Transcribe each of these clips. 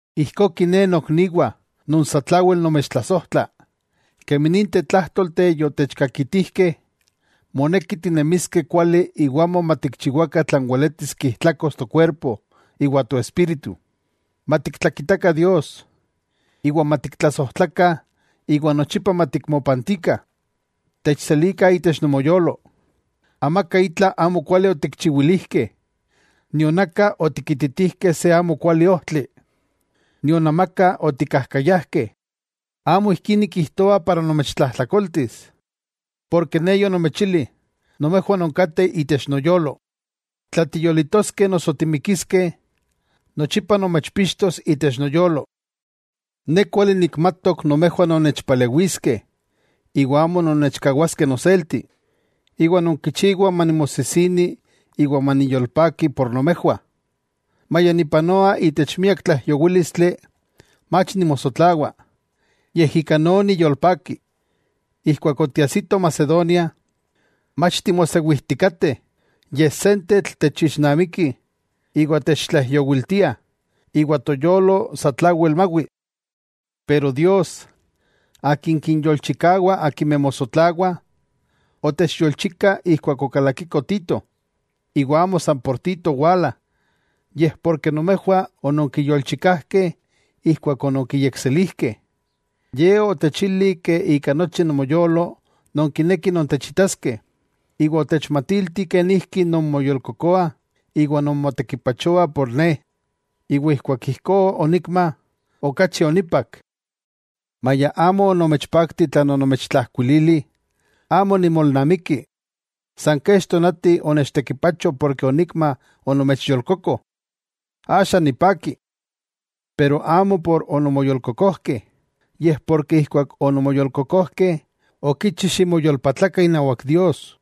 Ijkó kiné nokniwah non satlawel nomechtlasojtla, kemi ninteh tlájtolteh yotechkakitijkeh, moneki tinemiskeh kuali iwa amo matikchiwakah tlan weletis kijtlakos tokuerpo iwa toespíritu. Matiktlakitakah Dios, iwa matiktlasojtlakah iwa nochipa matikmopantikah. ¡Techselikah itech nomoyolo! Amaka itla amo kuali otikchiwilijkeh, nion aka otikititijkeh se amo kuali ojtli, nion amaka otikkajkayajkeh. Amo ijkí nikijtoa para nomechtlajtlakoltis. Porke ne yonomechili nomejwah nonkateh itech noyolo. Tla tiyolitoskeh noso timikiskeh, nochipa nomechpixtos itech noyolo. Ne kuali nikmatok nomejwah nonnechpalewiskeh iwa amo nonnechkawaskeh noselti, iwa nonkichiwah manimosisini iwa maniyolpaki por nomejwah. Maya nipanoa itech miak tlaijyowílistli, mach nimosotlawa, yej ika no niyolpaki. Ijkuak otiajsikoh Macedonia, mach timosewijtikateh, yej sentetl techixnamikih iwa techtlaijyowiltiah, iwa toyolo satlawel mawi. Pero Dios, Akin kinyolchikawa akimeh mosotlawah, otechyolchika ijkuak okalakiko Tito. Iwa amo san por Tito owala, yej porke nomejwah ononkiyolchikajkeh ijkuak ononkiyekselijkeh. Ye otechili ika nochi nomoyolo nonkinekih nontechitaskeh, iwa otechmatilti kenijki nonmoyolkokoah iwa nonmotekipachoah por ne. Ijkuak ijkó onikma, okachi onipak. Maya amo onomechpakti tlan onomechtlajkuilili, amo nimolnamikki. San kech tonati onechtekipacho porke onikma onomechyolkoko. Axa nipaki. Pero amo por ononmoyolkokojkeh, yej porke ijkuak ononmoyolkokojkeh okichi ximoyolpatlakah inawak Dios.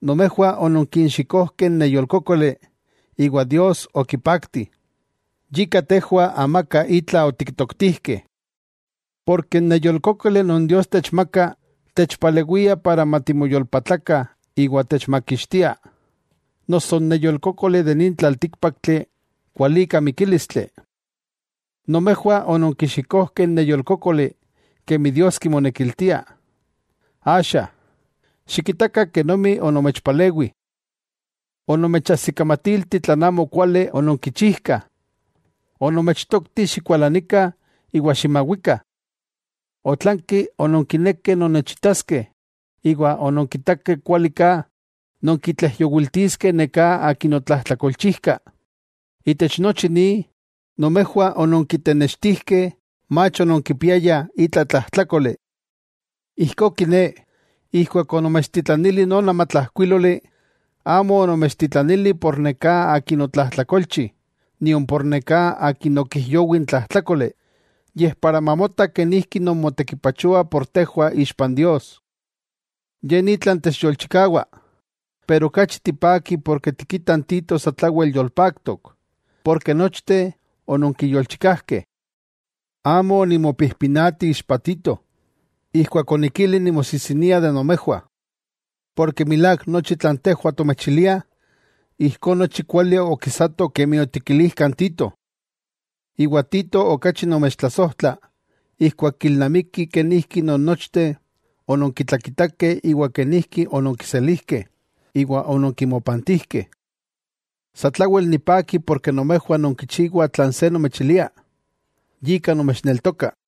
Nomejwah ononkixikojkeh n neyolkókoli iwa Dios okipakti, yika tejwah amaka itla otiktoktijkeh. Porke n neyolkókoli non Dios techmaka, techpalewia para matimoyolpatlakah iwa techmakixtia. Noso n neyolkókoli de nin tlaltíkpaktli, kualika mikílistli. Nomejwah ononkixikojkeh n neyolkókoli kemi Dios kimonekiltia, axa ¡xikitakah kenomi onomechpalewi! Onomechajsikamatilti tlan amokuali ononkichijkah. Onomechtokti xikualanikah iwa ximawikah. Otlanki ononkinekeh nonnechitaskeh, iwa ononkitakeh kuali ka nonkitlaijyowiltiskeh neká akin otlajtlakolchijka. Itech nochi ni, nomejwah ononkitenextijkeh mach ononkipiayah itla tlajtlákoli. Ijkó kiné, ijkuak onomechtitlanili non amatlajkuíloli, amo onomechtitlanili por neká akin otlajtlakolchi nion por neká akin okijyowi n tlajtlákoli, yej para mamota kenijki nonmotekipachoah por tejwah ixpa n Dios. Ye ni tlan techyolchikawa. Pero okachi tipakih porke tikitah n Tito satlawel yolpaktok, porke nochteh ononkiyolchikajkeh. Amo onimopijpinati ixpa Tito, ijkuak onikili nimosijsinia de nomejwah. Porke milák nochi tlan tejwah tomechiliah, ijkó nochi kuali okisato kemi otikilijkah n Tito. Iwa Tito okachi nomechtlasojtla ijkuak kilnamiki kenijki non nochteh ononkitlakitakeh iwa kenijki ononkiselijkeh iwa ononkimopantijkeh. Satlawel nipaki porke nomejwah nonkichiwah tlan se nomechilia, yika nomechneltoka.